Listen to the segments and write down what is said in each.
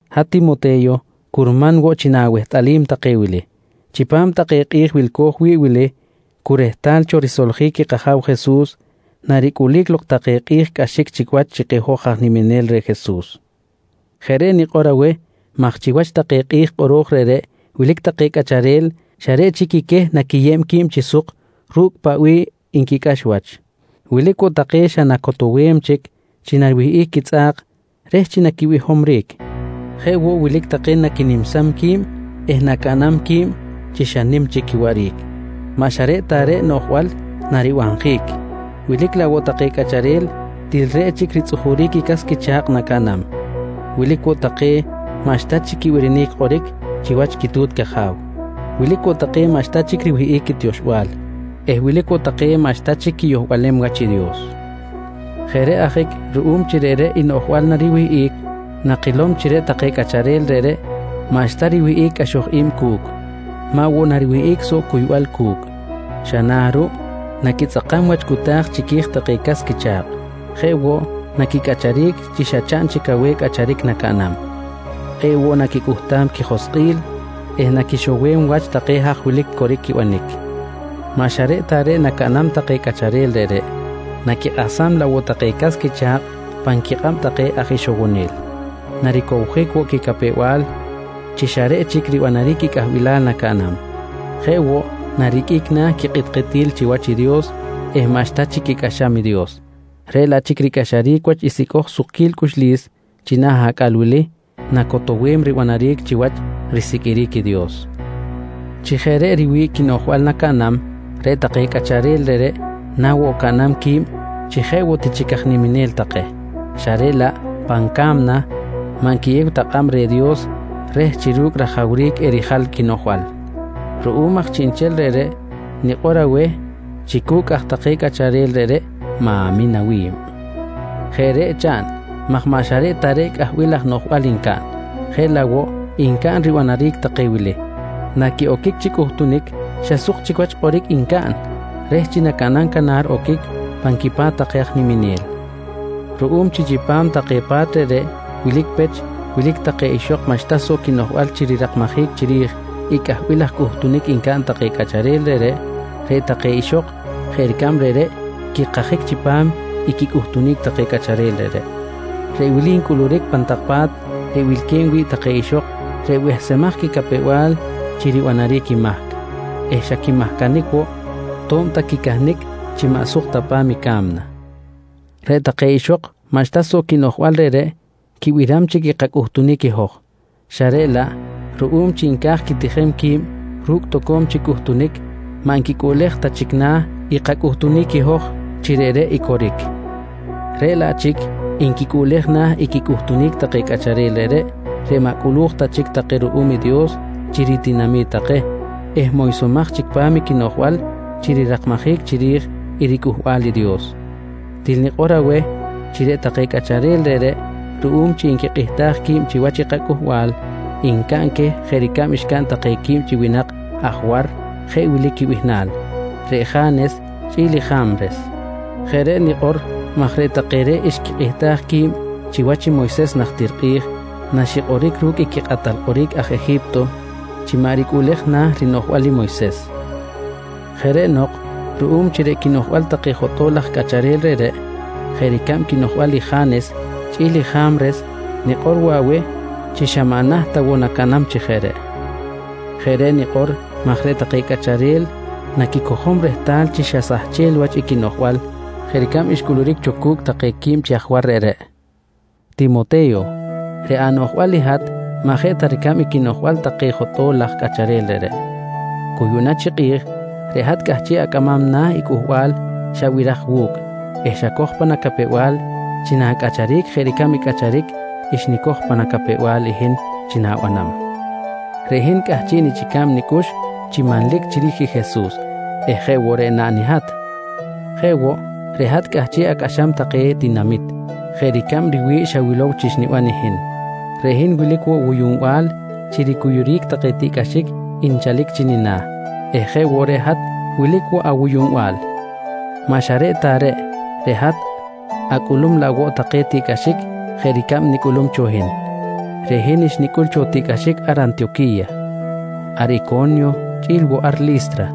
Hat Timote̱yo, curman woꞌ chi na̱wehtꞌalim take wili: Chipam take kꞌi̱j wilco̱j wi̱ꞌ wili cu rehtal cho risoljic i kAja̱w Jesus, naricꞌulic lok take kꞌi̱j cꞌaxic chic wach chi keh hoj aj niminel reh Jesus. Jeꞌ reꞌ nikꞌor aweh maj chiwach take kꞌi̱j kꞌoro̱j reꞌreꞌ, wilic take cꞌacharel xa reꞌ chic i queh naquiyeb qui̱b chi suk ru̱cꞌ paꞌ bih nquicꞌax wach. Wilic woꞌ take xa nacotowem chic chi nariwihꞌic quitzꞌa̱k reh chi naquibihomric. Jeꞌ woꞌ, wilic take naquinimsam qui̱b eh nacaꞌnam qui̱b chi xa nim chic quiwaꞌric. Maꞌ xa reꞌ ta reꞌ noꞌjbal naribanjic, wilic laꞌ woꞌ take cꞌacharel til reꞌ chic ritzꞌujuric i cas quicha̱kꞌ nacaꞌnam. Wilic woꞌ take maꞌxta chic quibirinic kꞌoric chiwach quitu̱t caja̱w. Wilic woꞌ take maꞌxta chic riwi̱ꞌ quitioxbal eh wilic woꞌ take maꞌxta chic quiyohlem wach i Dios. Jeꞌ reꞌ ajic ruꞌum chi reꞌreꞌ i noꞌjbal nariwihꞌic, nakilom chi reꞌ take cꞌacharel reꞌreꞌ maꞌxta riwihꞌic cꞌaxoj i̱b cu̱cꞌ. Maꞌ woꞌ nariwihꞌic soꞌ cuybal cu̱cꞌ. Xa na̱ ruꞌ, naquitzꞌakam wach cꞌuta̱j chiqui̱j take cas quicha̱kꞌ. Jeꞌ woꞌ, naquicꞌacharic chi xa chaꞌn chic aweh cꞌacharic nacaꞌnam. Kꞌe̱ꞌ woꞌ naquicꞌuhtam quijoskꞌil eh naquixowem wach take haj wilic coric quibanic. Maꞌ xa reꞌ ta reꞌ nacaꞌnam take cꞌacharel reꞌreꞌ, naquikꞌahsam laꞌ woꞌ take cas quicha̱kꞌ pan quikꞌab take aj ixowonel. Naricowjic woꞌ quicapew-bal chi xa reꞌ chic ribanaric i cꞌahbilal nacaꞌnam. Jeꞌ woꞌ, nariqꞌuic na̱ quikꞌitkꞌitil chiwach i Dios eh maꞌxta chic quicꞌaxam i Dios, reꞌ laꞌ chic ricꞌaxaric wach i sicꞌoj sukquil quicꞌux china̱ acꞌal wili nacotowem ribanaric chiwach risiqꞌuiric i Dios. Chi jeꞌ reꞌ riwi̱ꞌ quinoꞌjbal nacaꞌnam, reꞌ take cꞌacharel reꞌreꞌ na woꞌ caꞌnam qui̱b chi jeꞌ woꞌ ti chic aj niminel take xa reꞌ laꞌ pan ca̱mna maꞌ nquiyew ta kꞌab reh Dios reh chi ru̱cꞌ rajawric erijal i quinoꞌjbal. Ruꞌum aj chiꞌnchel reꞌreꞌ nikꞌor aweh chi cu̱cꞌ aj take cꞌacharel reꞌreꞌ ma̱min awi̱b. Jeꞌ reꞌ chaꞌn maj maꞌ xa reꞌ ta reꞌ cꞌahbil laj noꞌjbal ncaꞌn, jeꞌ laꞌ woꞌ ncaꞌn ribanaric take wili: Naquiꞌoquic chi cꞌuhtunic xa suk chic wach kꞌoric ncaꞌn reh chi nacaꞌnam canar oquic pan quipa̱t take aj niminel. Ruꞌum chi chipam take pa̱t reꞌreꞌ wilic pech wilic take ixok maꞌxta soꞌ quinoꞌjbal chi rirakmajic chiri̱j i cꞌahbil laj cꞌuhtunic ncaꞌn take cꞌacharel reꞌreꞌ, reꞌ take ixok jeꞌ ricab reꞌreꞌ quikajic chipam i quicꞌuhtunic take cꞌacharel reꞌreꞌ. Reꞌ wili ncꞌuluric pan tak pa̱t reꞌ wilque̱b wi̱ꞌ take ixok reꞌ behsemaj quicapew-bal chi ribanaric i mahc eh xa quimahcanic woꞌ, to̱b ta quicahnic chi maꞌ suk ta pa̱m i ca̱mna. Reꞌ take ixok maꞌxta soꞌ quinoꞌjbal reꞌreꞌ quibiram chic i kacꞌuhtunic i hoj xa reꞌ laꞌ ruꞌum chi nca̱j quitijem qui̱b ru̱cꞌ toco̱m chic cꞌuhtunic, maꞌ nquicꞌuꞌlej ta chic na̱ i kacꞌuhtunic i hoj chi reꞌreꞌ i coric. Reꞌ laꞌ chic nquicꞌuꞌlej na̱ i quicꞌuhtunic take cꞌacharel reꞌreꞌ, reꞌ maꞌ cꞌulu̱j ta chic take ruꞌum i Dios chi ritinami̱t take eh moysomaj chic pa̱m i quinoꞌjbal chi rirakmajic chiri̱j i riCꞌuhbal i Dios. Til nikꞌor aweh chi reꞌ take cꞌacharel reꞌreꞌ ruꞌum chi nquikꞌihtaj qui̱b chiwach i kacꞌuhbal, ncaꞌn queh jeꞌ ricab xcaꞌn take quib chi winak aj war jeꞌ wili quibihnal: Reꞌ Ja̱nes chꞌi̱l i Ja̱mres. Jeꞌ reꞌ nikꞌor maj reꞌ take reꞌreꞌ xquikꞌihtaj qui̱b chiwach i Moyses najtir kꞌi̱j naxikꞌoric ru̱cꞌ i quikꞌatal kꞌoric aj Eji̱pto chi maꞌ ricꞌuꞌlej na̱ rinoꞌjbal i Moyses. Jeꞌ reꞌ nok, ruꞌum chi reꞌ quinoꞌjbal take jotꞌo̱l laj cꞌacharel reꞌreꞌ jeꞌ ricab quinoꞌjbal i Ja̱nes chꞌi̱l i Ja̱mres, nikꞌor woꞌ aweh chi xa maꞌ naht ta woꞌ nacaꞌnam chi jeꞌ reꞌ. Jeꞌ reꞌ nikꞌor maj reꞌ take cꞌacharel naquicojom rehtal chi xa sahchel wach i quinoꞌjbal jeꞌ ricab xcꞌuluric cho cu̱cꞌ take quib chi aj war reꞌreꞌ. Timote̱yo, reꞌ anoꞌjbal i hat maꞌ jeꞌ ta ricab i quinoꞌjbal take jotꞌo̱l laj cꞌacharel reꞌreꞌ. Cu yuꞌna chi kꞌi̱j, reꞌ hat cꞌahchiꞌ acꞌamam na̱ i cꞌuhbal xabiraj wu̱cꞌ eh xacoj pan acapew-bal chi na̱cꞌacharic jeꞌ ricab i cꞌacharic xnicoj pa nicapew-bal i hin chi nanibanam. Reꞌ hin cꞌahchiꞌ nichꞌica̱b nicꞌux chi manlic chiri̱j i Jesus eh jeꞌ woꞌ reꞌ naꞌn i hat. Jeꞌ woꞌ, reꞌ hat cꞌahchiꞌ acꞌaxam take tinamit jeꞌ ricab riwi̱ꞌ xawilow chi xniban i hin. Reꞌ hin wilic woꞌ wuyunbal chi ricuyuric take tiꞌcꞌaxic nchalic chi nina̱ eh jeꞌ woꞌ reꞌ hat wilic woꞌ awuyuꞌnbal. Maꞌ xa reꞌ ta reꞌ, reꞌ hat acꞌulum laꞌ woꞌ take tiꞌcꞌaxic jeꞌ ricab nicꞌulum cho hin. Reꞌ hin xnicꞌul cho tiꞌcꞌaxic ar Antiyoqui̱ya, ar Ico̱nyo chꞌi̱l woꞌ ar Li̱stra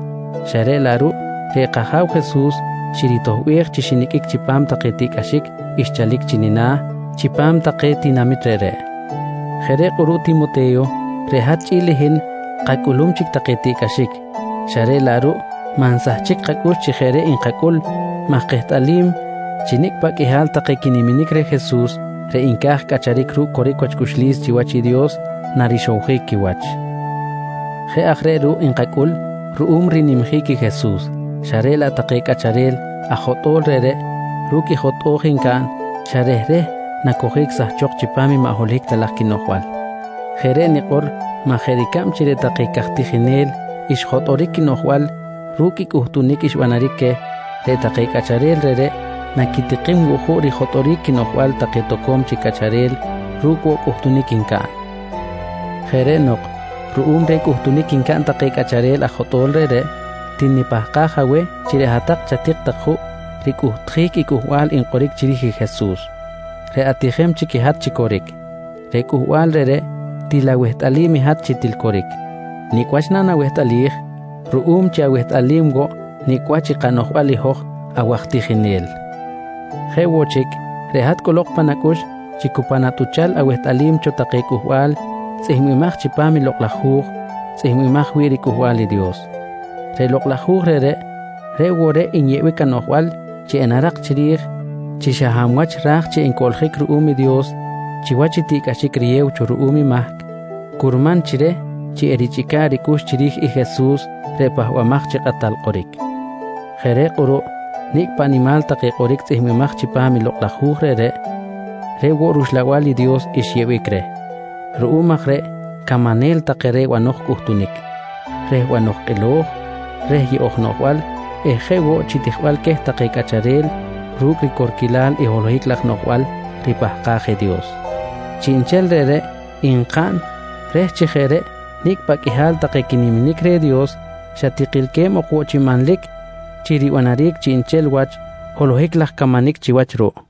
xa reꞌ laꞌ ruꞌ reꞌ kAja̱w Jesus xiritoꞌbej chi xiniqꞌuic chipam take tiꞌcꞌaxic xchalic chi nina̱ chipam take tinamit reꞌreꞌ. Jeꞌ reꞌ kꞌuruꞌ Timote̱yo, reꞌ hat chꞌi̱l i hin kacꞌulum chic take tiꞌcꞌaxic, xa reꞌ laꞌ ruꞌ maꞌ nsahchic kacꞌux chi jeꞌ reꞌ nkacꞌul maj kehtꞌalim chi nicꞌ paꞌ qꞌuihal take quiniminic reh Jesus reꞌ nca̱j cꞌacharic ru̱cꞌ coric wach cꞌuxlis chiwach i Dios narixowjic quiwach. Jeꞌ aj reꞌ ruꞌ nkacꞌul ruꞌum rinimjic i Jesus xa reꞌ laꞌ take cꞌacharel aj jotꞌo̱l reꞌreꞌ ru̱cꞌ i jotꞌo̱j ncaꞌn, xa rehreh nacojic sahchok chipam i maꞌ holohic ta laj quinoꞌjbal. Jeꞌ reꞌ nikꞌor maj jeꞌ ricab chi reꞌ take caj tijinel xjotꞌoric quinoꞌjbal ru̱cꞌ i cꞌuhtunic xbanaric queh, reꞌ take cꞌacharel reꞌreꞌ naquitikim woꞌ juꞌ rijotꞌoric quinoꞌjbal take toco̱m chic cꞌacharel ru̱cꞌ woꞌ cꞌuhtunic ncaꞌn. Jeꞌ reꞌ nok ruꞌum reh cꞌuhtunic ncaꞌn take cꞌacharel aj jotꞌo̱l reꞌreꞌ, til nipahkaj aweh chi reꞌ hat chatik juꞌ ricꞌuhtjic i cꞌuhbal nkꞌoric chiri̱j i Jesus, reꞌ atijem chic i hat chi coric. Reꞌ cꞌuhbal reꞌreꞌ til awehtꞌalim i hat chi til coric. Nicꞌ wach nanawehtꞌalij? Ruꞌum chi awehtꞌalim woꞌ nicꞌ wach i kanoꞌjbal i hoj awaj tijinel. Jeꞌ woꞌ chic reꞌ hat cꞌolok pan acꞌux chi cu pan atꞌuchal awehtꞌalim cho take cꞌuhbal tzꞌihmbimaj chipam Lokꞌ laj Hu̱j tzꞌihmbimaj wi̱ꞌ riCꞌuhbal i Dios. Reꞌ lokꞌ laj hu̱j reꞌreꞌ, reꞌ woꞌ reꞌ nyeꞌbic anoꞌjbal chi enarak chiri̱j chi xa hab wach ra̱j chi encoꞌljic ruꞌum i Dios chiwach i tiꞌcꞌaxic riyew cho ruꞌum i mahc, curman chi reh chi erichꞌica̱ꞌ ricꞌux chiri̱j i Jesus reꞌ Pahbamaj chi Kꞌatal Kꞌoric. Jeꞌ reꞌ kꞌuruꞌ nicꞌ paꞌ nimal take kꞌoric tzꞌihmbimaj chipam i Lokꞌ laj Hu̱j reꞌreꞌ, reꞌ woꞌ rUxlabal i Dios xyeꞌbic reh. Ruꞌum aj reꞌ camanel take reh bano̱j cꞌuhtunic, reh banoj kꞌilo̱j, reh yeꞌo̱j noꞌjbal eh jeꞌ woꞌ chi tijbal queh take cꞌacharel ru̱cꞌ ricorquilal i holohic laj noꞌjbal ripahkaj i Dios. Chiꞌnchel reꞌreꞌ nkaꞌn reh chi jeꞌ reꞌ nicꞌ paꞌ qꞌuihal take quiniminic reh Dios xa tikilque̱b ok woꞌ chi manlic chi ribanaric chiꞌnchel wach holohic laj camanic chiwach ruꞌ.